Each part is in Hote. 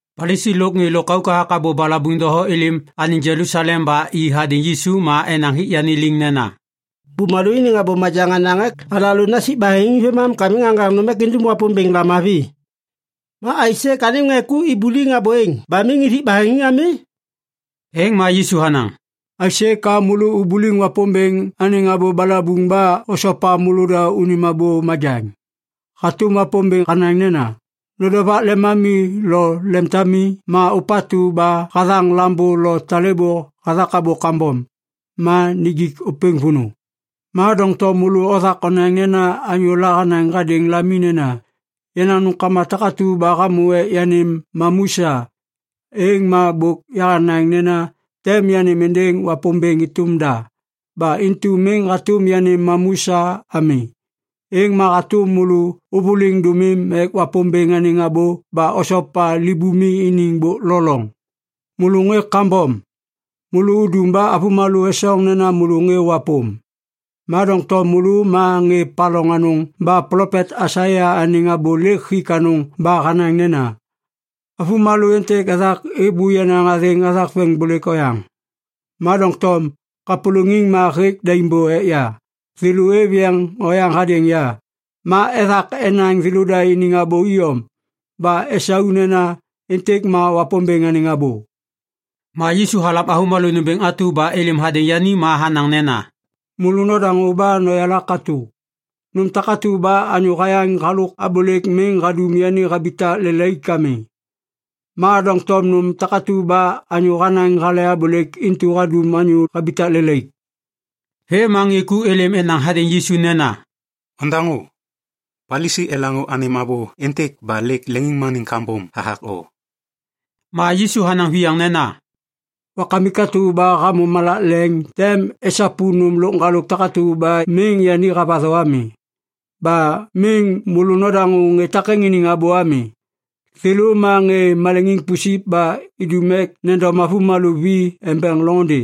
Palisi lôk ŋê lôkauk hathak abô balabuŋ doho êlêm anêŋ Jelusalem ba i hadêŋ Yisu ma enaŋ hik yani liŋ nena, “Bumalô iniŋ abô majaŋ hanaŋ ek alalô nasik baheŋiŋ vêmam ka miŋ aŋgaŋ nôm ek indum Wapômbêŋ lamavi. Ma aisê ka anêm ŋê ku ibuliŋ abô êŋ ba miŋ ithik baheŋiŋ ami?” Êŋ ma Yisu hanaŋ, “Aisê ka môlô ubuliŋ Wapômbêŋ anêŋ abô balabuŋ ba osopa môlôda unim abô majaŋ? Hatôm Wapômbêŋ hanaŋ nena, ‘Nodovak lemami lo lemtami’ ma ‘Ôpatu ba hathaŋ lambô lo talêbô hathak abô kambom, ma nijik ôpêŋ vônô.’ Ma doŋtom môlô othak onaŋ nena anyôla hanaŋ hadêŋ lami nena, ‘Yenaŋ nômkama takatu ba hamô ek yanêm mamu sa, êŋ ma bôk yahanaŋ nena tem yanêm êndêŋ Wapômbêŋ êtôm da. Ba intu miŋ hatôm yanêm mamu sa ami.’ Êŋ ma hatôm môlô ôvôliŋ dômim ek Wapômbêŋ anêŋ abô ba osopa libumi iniŋ bôk lo loŋ. Môlô ŋê kambom! Môlô udum ba avômalô esoŋ nena môlô ŋê wapôm. Ma doŋtom môlô ma ŋê paloŋ anôŋ ba plopet Aisaia anêŋ abô lêk hik anôŋ ba hanaŋ nena, “‘Avômalô êntêk êbô yenaŋ athêŋ hathak veŋiŋbôlêk oyaŋ. Ma doŋtom kapôlôŋiŋ ma hêk daim bô ek ya. Thêlô êv yeŋ oyaŋ hadêŋ ya. Ma ethak enaŋ thêlôda iniŋ abô iyom ba esau nena, “Êntêk ma Wapômbêŋ anêŋ abô.”’” Ma Yisu halam avômalô nômbêŋ atu ba êlêm hadêŋ yani ma hanaŋ nena, “Môlô nodaŋô ba noyala katô. Nôm takatu ba anyô hayaŋ halôk abôlêk miŋ hadum yani habitak lelaik ami. Ma doŋtom nôm takatu ba anyô hanaŋ hale abôlêk intu hadum anyô habitak lelaik.” Vêm ma ŋê ku êlêm enaŋ hadêŋ Yisu nena, “Ondaŋô. Palisi elaŋô anêm abô êntêk ba lêk leŋiŋmaniŋ kambom hathak o.” Ma Yisu hanaŋ viyaŋ nena, “Wakamik atu ba hamô malak leŋ tem esapu nôm lôk ŋgalôk takatu ba miŋ yani havatho ami. Ba miŋ môlô nodaŋô ŋê takêŋ iniŋ abô ami. Thêlô ma ŋê maleŋiŋ pusip ba idum ek nendom avômalô vi embeŋ loŋôndê.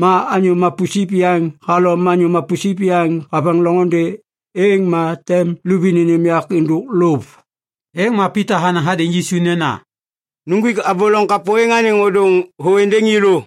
Ma anyô mapusip yaŋ halom anyô mapusip yaŋ haveŋ loŋôndê, êŋ ma tem luvi nênêm yak êndôk lôv.” Êŋ ma Pita hanaŋ hadêŋ Yisu nena, “Nuŋgwik abô loŋ kapô êŋ anêŋ ôdôŋ thô êndêŋ yêlô.”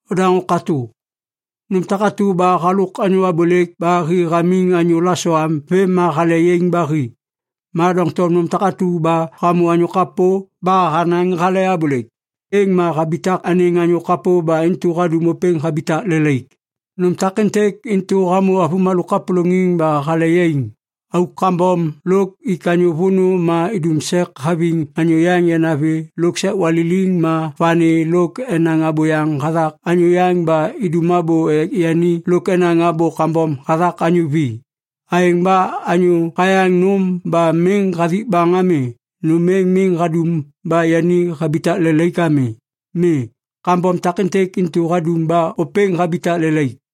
Odaŋô katô! Nôm takatu ba halôk anyô abôlêk ba hi hamiŋ anyô lasoam vêm ma hale yaiŋ ba hi. Ma doŋtom nôm takatu ba hamô anyô kapô ba hanaŋ hale abôlêk, êŋ ma habitak anêŋ anyô kapô ba intu hadum ôpêŋ habitak lelaik. Nôm takêntêk intu hamô avômalô kapôlôŋiŋ ba hale yaiŋ: auk kambom lôk ik anyô vônô ma idum sek haviŋ anyô yaŋ yanavi lôk sek waliliŋ ma vani lôk enaŋ abôyaŋ hathak anyô yaŋ ba idum abô ek yani lôk enaŋ abô kambom hathak anyô vi. Aêŋ ba anyô hayaŋ nôm ba miŋ hathik baŋ ami, nôm êŋ miŋ hadum ba yani habitak lelaik ami. Mi. Kambom takêntêk intu hadum ba ôpêŋ habitak lelaik.”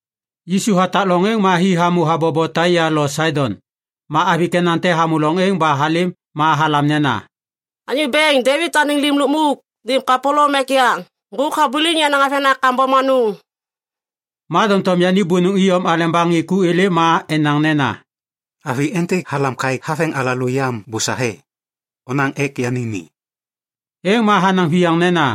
Yisu hatak loŋ êŋ ma hi hamô habobo Taia lo Saidon. Ma avi Kenan te hamô loŋ êŋ ba halêm ma halam nena, “Anyô Bêŋ! Devit anêŋ Lim Lukmuk! Nêm kapôlôm ek ya! Ŋgôk habuliŋ yenaŋ avena kambom anôŋ.” Ma doŋtom yani bônôŋ iyom aleba ŋê ku êlêm ma enaŋ nena, “Avi êntêk halam kaêk haveŋ alalô yam bôsahe! Onaŋ ek yani ni!” Êŋ ma hanaŋ viyaŋ nena,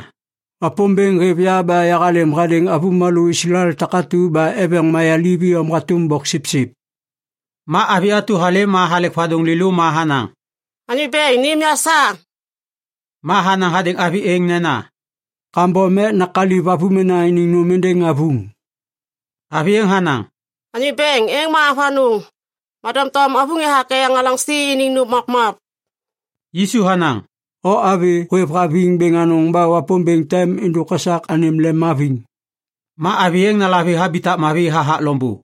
“Wapômbêŋ hêv ya ba yahalêm hadêŋ avômalô Islael takatu ba eveŋ mayaliv iyom hatôm bôksipsip.” Ma avi atu halêm ma halek vadôŋ lêlô ma hanaŋ, “Anyô bêŋ, nêm ya sa!” Ma hanaŋ hadêŋ avi êŋ nena, “Kambom ek nakaliv avômena iniŋ nôm êndêŋ avuŋ.” Avi êŋ hanaŋ, “Anyô Bêŋ, êŋ ma avanôŋ. Ma doŋtom avuŋ ethak eyaŋ alaŋsi iniŋ nôm mapmap.” Yisu hanaŋ, “O avi hôêvhaviŋ bêŋ anôŋ ba Wapômbêŋ tem êndôk esak anêm lemhaviŋ.” Ma avi êŋ nalavi habitak mavi hathak loŋbô.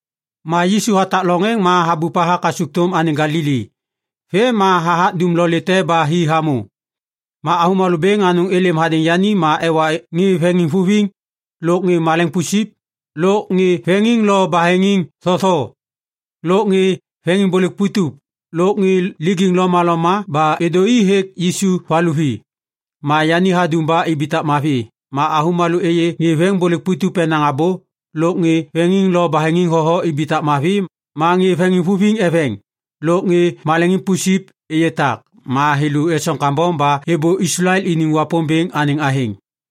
Ma Yisu hatak loŋ êŋ ma habup hathak kasukthôm anêŋ Galili. Vêm ma hathak dumlolê te ba hi hamô. Ma avômalô bêŋ anôŋ êlêm hadêŋ yani ma ewa ŋê veŋiŋvuviŋ, lôk ŋê maleŋiŋ pusip, lôk ŋê veŋiŋ lo baheŋiŋ thotho, lôk ŋê veŋiŋbôlêk putup, lôk ŋê lijiŋ lomaloma ba êdô i hêk Yisu valuvi. Ma yani hadum ba ibitak mavi. Ma avômalô êyê ŋê veŋiŋbôlêk putup enaŋ abô, lôk ŋê veŋiŋ lo baheŋiŋ thotho ibitak mavi, ma ŋê veŋiŋvuviŋ eveŋ, lôk ŋê maleŋiŋ pusip êyê tak. Ma thêlô esoŋ kambom ba êbô Islael iniŋ Wapômbêŋ anêŋ athêŋ.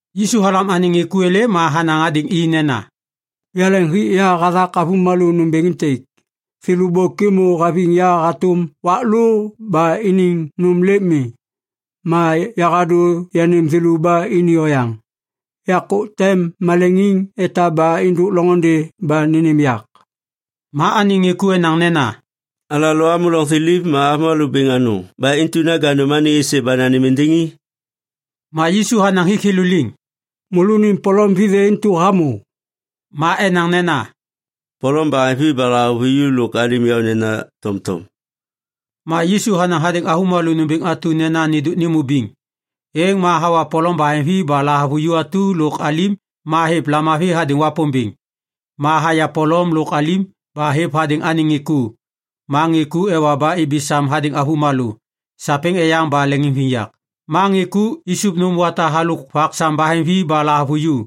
Yisu halam anêŋ ŋê ku êlêm ma hanaŋ hadêŋ i nena, “Yaleŋ hik ya hathak avômalô nômbêŋ êntêk. Thêlô bôk êmô haviŋ ya hatôm wak lô ba iniŋ nôm lêk mi. Ma yahadô yanêm thêlô ba ini oyaŋ. Yakô tem maleŋiŋ etaba êndôk loŋôndê ba nênêm yak.” Ma anêŋ ŋê ku enaŋ nena, “Alalô amô loŋ thiliv ma avômalô bêŋ anôŋ ba intu naja nôm anêŋ êsê ba nanêm êndêŋ i?” Ma Yisu hanaŋ hik thêlô liŋ, “Môlônim polom vithê intu hamô?” Ma enaŋ nena, “Polom baheŋvi ba lahavuju lôk alim yaônena tomtom.” Ma Yisu hanaŋ hadêŋ avômalô nômbêŋ atu nena nêndôk nêmô biŋ. Êŋ ma hawa polom baheŋvi ba lahavuju atu lôk alim ma hêv lamavi hadêŋ Wapômbêŋ. Ma haya polom lôk alim ba hêv hadêŋ anêŋ ŋê ku. Ma ŋê ku ewa ba ibi sam hadêŋ avômalô. Sapêŋ eyaŋ ba leŋiŋviyak ma ŋê ku isup nôm wata halôk vak sam baheŋvi ba lahavuju.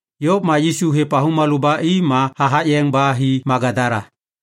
Yôv ma Yisu hêv avômalô ba i ma hathak yeŋ ba hi Magadala.